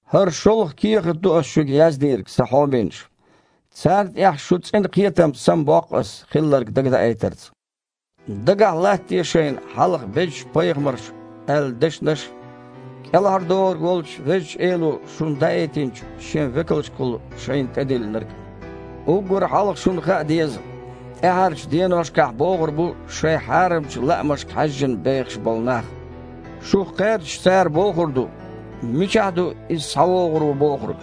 ХІара шолгІа кехат ду ас шуьга яздийриг, сан хьоменаш. Царна тІехь шун цІена кхетам самабоккху ас хилларг дагадаийтарца. Дагахь латтаде шайна хьалха безачу пайхамарша аьлла дешнаш а, КІелхьардохург волчу Везачу Эло шуна даийтинчу Шен векалшкахула шайна тІедиллинарг а. Уггар хьалха шуна хаа деза, тІаьхьарчу деношкахь богІур бу шайн хьарамчу лаамашка хьаьжжина бехаш болу нах. Шух кхаьрдаш, цара бохур ду: «Мичахь ду Иза схьавогІур ву бохург?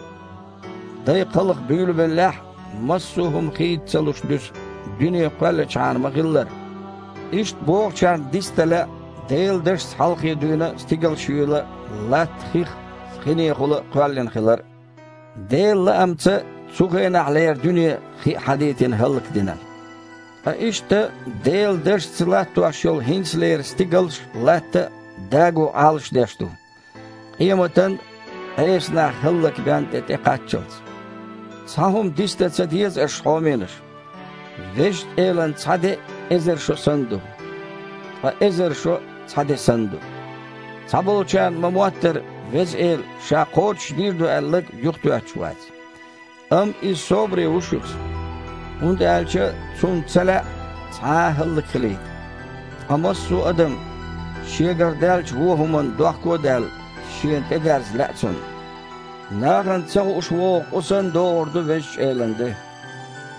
Дай кхалха буьйлабеллехь а, массо а хІума хийца ца луш дуьсу, дуьне кхоьлличхьана ма-хиллара». Иштта бохучарна дицдан лаьа Делан дашца хьалххе дуьйна стигалш юйла а, латта хих а, хинехула а кхоьллина хилар а. Делан лаамца цу хенахьлера дуьне, хи а хьадийтина, хІаллакдина. Ткъа иштта Делан дашца латтош йолу хІинцалера стигалш а, латта а даго Іалашдеш ду, къематан а, Іеса нах хІаллакбен а де тІекхаччалц. Цхьа хІума дицдан ца деза аша, хьоменаш, Везачу Элан цхьа де эзар шо санна ду, ткъа эзар шо цхьа де санна ду. Цхьаболчарна ма-моттара, Веза Эла Ша кхочушдийр ду аьлларг юхатоьттуш вац. Амма Иза собаре ву шуьца, хІунда аьлча Цунна ца лаьа цхьа а хІаллакьхилийта, ткъа массо а адам, шегара даьллачу вочу хІуманна дохко а даьлла, Шена тІедерза лаьа Цунна. Нахана ца хууш вогІу къу санна, догІур ду Везачу Элан де,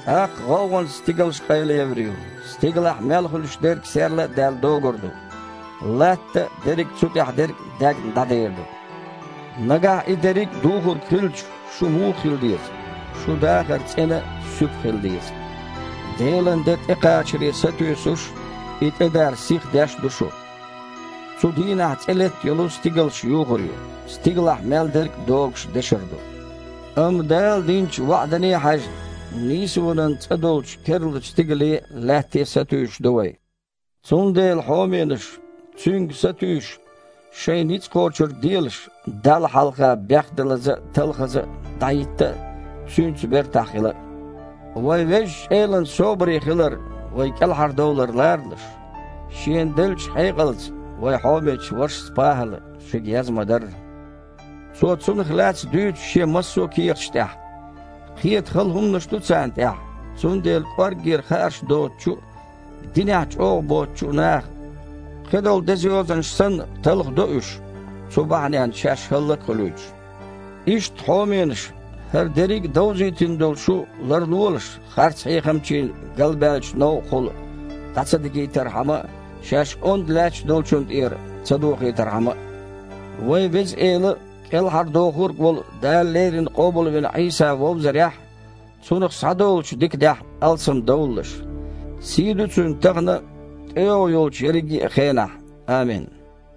тІаккха гІовгІанца стигалш къайлаевр ю, стигалахь мел хуьлуш дерг, серла а даьлла, догур ду, латта а, дерриг а цу тІехь дерг а, даьгна, дІадер ду. Нагахь и дерриг а духург хилча, шу муха хила деза? Шун дахар цІена а, суьпа а хила деза, Делан де тІекхачаре сатуьйсуш а, и тІедар сихдеш а ду шу. Цу дийнахь цІе летта йолу стигалш юхур ю, стигалахь мел дерг, догуш, дешар ду. Амма, Дала динчу ваІдане а хьаьжна, нийсонан цІа долчу керлачу стигале а, лаьтте а сатуьйсуш ду вай. Цундела, хьоменаш, цуьнга сатуьйсуш, шайн ницкъ кхочург делаш Далла хьалха бехдалаза а, талхаза а дІахІитта а, Цуьнца бертахь хила а. Вайн Везачу Элан собаре хилар вайн кІелхьардовлар ларалаш, шена деллачу хьекъалца вайн хьомечу вашас ПахІала шуьга яз-ма-дарра. Цо цунах лаьцна дуьйцу шен массо а кехаташ тІехь. Кхета хала хІуманаш ду царна тІехь, цундела кІорггера хаарш доцучу а, динехь чІогІа боцучу а наха, кхидолу Деза Йозанаш санна, талхадо уьш, цу бахьаненна шаьш хІаллак а хуьлуьйтуш. Иштта, хьоменаш, хІара дерриг а довзийтина долу шу ларлолаш, харцхьехамчийн галбаьллачу новкъахула дІа ца дигийтархьама а, шаьш ондда лаьтташ долчунна тІера ца дохийтархьама а. Вайн Веза Эла а, КІелхьардохург а волу Дала леррина къобалвина Іийса вовзарехь а, Цунах схьадолучу диканехь а алсамдовлалаш. Сий ду Цуьнан тахана а, тІейогІу йолчу ерриге хенахь а. Амин.